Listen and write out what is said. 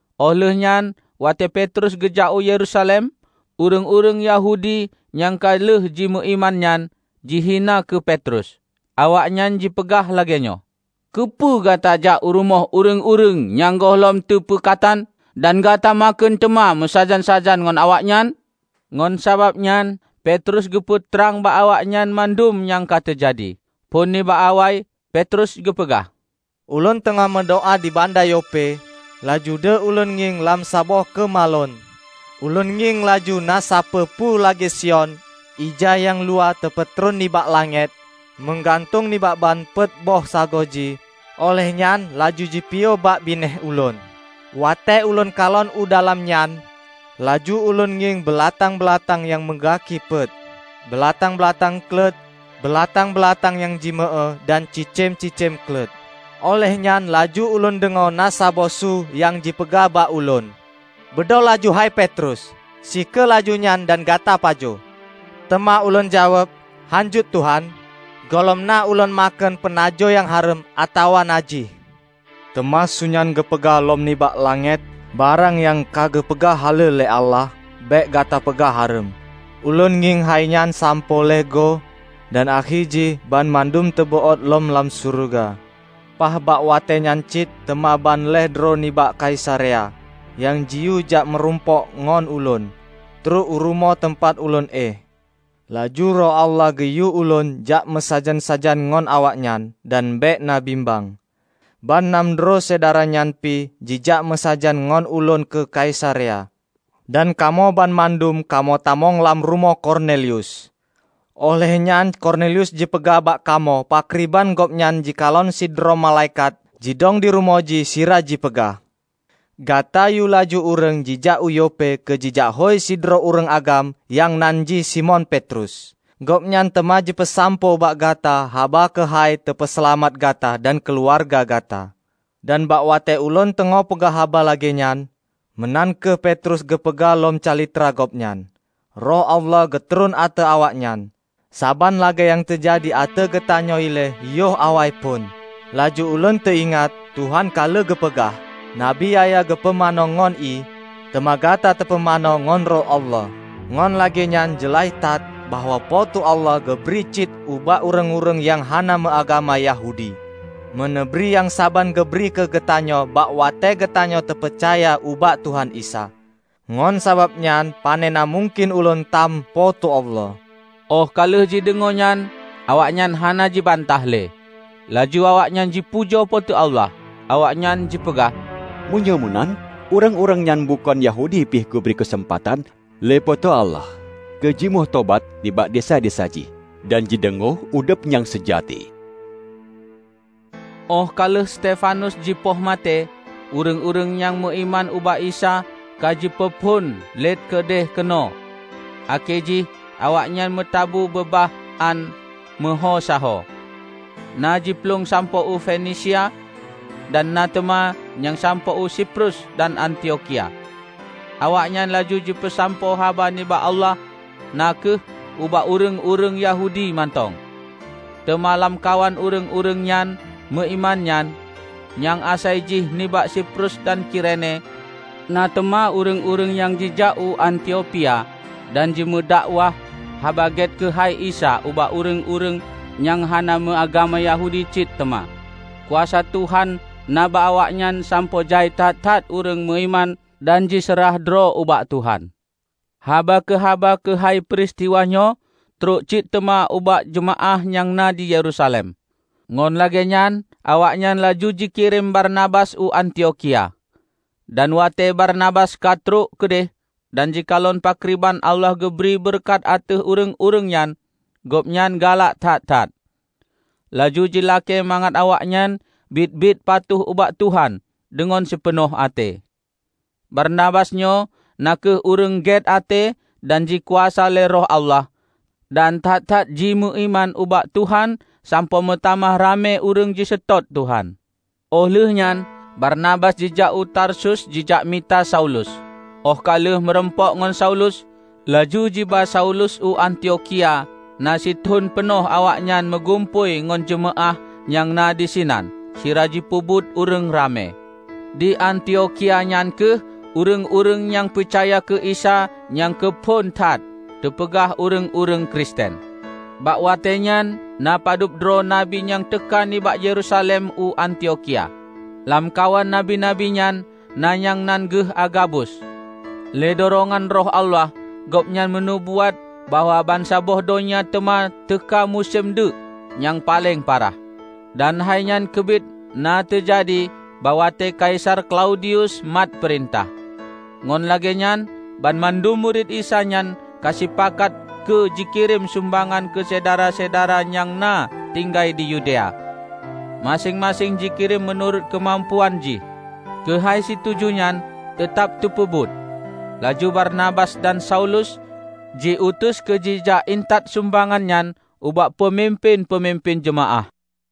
Óh lheueh nyan watée Petrus geujak u Yerusalem, ureuëng-ureuëng Yahudi nyang ka lheueh jimeuiman nyan, jihina keu Petrus. Awaknyan jipeugah lagée nyoe, "Keupeue gata jak u rumoh ureuëng-ureuëng nyang gohlom teupeukatan? Dan gata makheun teuma meusajan-sajan ngon awaknyan!" Ngon sabab nyan Petrus geupeu trang bak awaknyan mandum nyang ka teujadi, phon nibak awai, Petrus geupeugah, "Ulôn teungoh meudoá di banda Yope, laju deuh ulôn ngieng lam saboh keumalon. Ulôn ngieng laju na sapeue-peue lagée siôn ija nyang luwah teupeutreun nibak langét, meugantung nibak ban peuet boh sagoe jih, óh lheueh nyan laju jipiôh bak binéh ulôn. Watée ulôn kalon u dalam nyan, laju ulôn ngieng beulatang-beulatang nyang meugaki peuet, beulatang-beulatang kleut, beulatang-beulatang nyang jimeu-éue dan cicém-cicém kleut. Óh lheueh nyan laju ulôn deungoe na saboh su nyang jipeugah ubak ulôn, 'Beudôh laju hai Petrus! Sie kheueh laju nyan dan gata pajoh!' Teuma ulôn jaweueb, 'Hánjeuet Tuhan! Gohlom na ulôn makheun peunajoh nyang hareuem atawa najih.' Teuma su nyan geupeugah lom nibak langét, 'Barang nyang ka geupeugah haleue lé Allah bék gata peugah hareuem.' Ulôn ngieng hai nyan sampoe lhée goe dan akhé jih banmandum teubeuôt lom lam syeuruga. Paih bak watée nyan cit teuma ban lhée droe nibak Kaisarea, nyang jiyue jak meurumpok ngon ulôn, trok u rumoh teumpat ulôn éh. Laju Roh Allah geuyue ulôn jak meusajan-sajan ngon awaknyan dan bék na bimbeng. Ban nam droe syedara nyan pih jijak meusajan ngon ulôn u Kaisarea, dan kamoe banmandum kamoe tamong lam rumoh Kornelius. Óh lheueh nyan Kornelius jipeugah bak kamoe pakriban gobnyan jikalon sidroe malaikat jidong dirumoh jih sira jipeugah, 'Gata yue laju ureuëng jijak u Yope keu jijakhôi sidroe ureuëng agam nyang nan jih Simon Petrus. Gobnyan teuma jipeusampoe ubak gata haba keuhai teupeuseulamat gata dan keuluwarga gata.' Dan bak watée ulôn teungoh peugah haba lagée nyan," meunan kheueh Petrus geupeugah lom calitra gobnyan, "Roh Allah geutron ateueh awaknyan, saban lagée nyang teujadi ateueh geutanyoe ilée yoh awaiphon. Laju ulôn teuingat, Tuhan ka lheueh geupeugah, 'Nabi Yahya geupumanö ngon ié, teuma gata teupumanö ngon Roh Allah.' Ngon lagée nyan jeulaih that bahwa Po teu Allah geubri cit ubak ureuëng-ureuëng nyang hana meuagama Yahudi, meuneubri nyang saban geubri keu geutanyoe bak watée geutanyoe tapeucaya ubak Tuhan Isa. Ngon sabab nyan, panena mungken ulôn tam Po teu Allah!" Óh ka lheueh jideungoe nyan, awaknyan hana jibantah le. Laju awaknyan jipujoe Po teu Allah. Awaknyan jipeugah, "Meunyoe meunan, ureuëng-ureuëng nyang bukon Yahudi pih geubri keuseumpatan lé Po teu Allah keu jimeutobat nibak desya-desya jih dan jideungoe udeb nyang seujati!" Óh ka lheueh Stefanus jipoh maté, ureuëng-ureuëng nyang meuiman ubak Isa ka jipeuphon let keudeuh keunoe, akhé jih awaknyan meutabu beba hán meuhô sahoe. Na jiplueng sampoe u Fenisia, dan na teuma nyang sampoe u Siprus dan Antiokhia. Awaknyan laju jipeusampoe haba nibak Allah na kheueh ubak ureuëng-ureuëng Yahudi mantong. Teuma lamkawan ureuëng-ureuëng nyang meuiman nyan, nyang asai jih nibak Siprus dan Kirene, na teuma ureuëng-ureuëng nyang jijak u Antiophia dan jimeudakwah Haba Gét keuhai Isa ubak ureuëng-ureuëng nyang hana meuagama Yahudi cit teuma. Kuasa Tuhan na bak awaknyan sampoe jai that-that ureuëng meuiman dan jiseurah droe ubak Tuhan. Haba keuhaba keuhai peuristiwa nyoe trok cit teuma ubak jeumaáh nyang na di Yerusalem. Ngon lagée nyan awaknyan laju jikirém Barnabas u Antiokhia. Dan watée Barnabas ka trok keudeh, dan jikalon pakriban Allah geubri beureukat ateueh ureuëng-ureuëng nyan, gobnyan galak that-that. Laju jilakée mangat awaknyan biet-biet patuh ubak Tuhan deungon sipeunoh até. Barnabas nyoe na kheueh ureuëng gét até dan jikuasa lé Roh Allah dan that-that jimeuiman ubak Tuhan sampoe meutamah ramé ureuëng jiseutôt Tuhan. Óh lheueh nyan Barnabas jijak u Tarsus jijak mita Saulus. Óh ka lheueh meurumpok ngon Saulus, laju jiba Saulus u Antiokhia na sithon peunoh awaknyan meugumpôi ngon jeumaáh nyang na disinan sira jipeubeuet ureuëng ramé. Di Antiokhia nyan kheueh ureuëng-ureuëng nyang peucaya keu Isa nyang keuphon that teupeugah ureuëng-ureuëng Kristen. Bak watée nyan na pa dubdroe nabi nyang teuka nibak Yerusalem u Antiokhia. Lamkawan nabi-nabi nyan na nyang nan geuh Agabus. Lé durongan Roh Allah gobnyan meunubuat bahwa bansaboh donya teuma teuka musém deuk nyang paleng parah. (Dan hainyan keubiet na teujadi bak watée Kaisar Klaudius mat peurintah.) Ngon lagée nyan banmandum murit Isa nyan ka sipakat keu jikirém sumbangan keu syedara-syedara nyang na tinggai di Yudea; maséng-maséng jikirém meunurot keumampuan jih. Keuhai situju nyan teutab teupeubuet, laju Barnabas dan Saulus ji-utus keu jijak intat sumbangan nyan ubak peumimpén-peumimpén jeumaáh.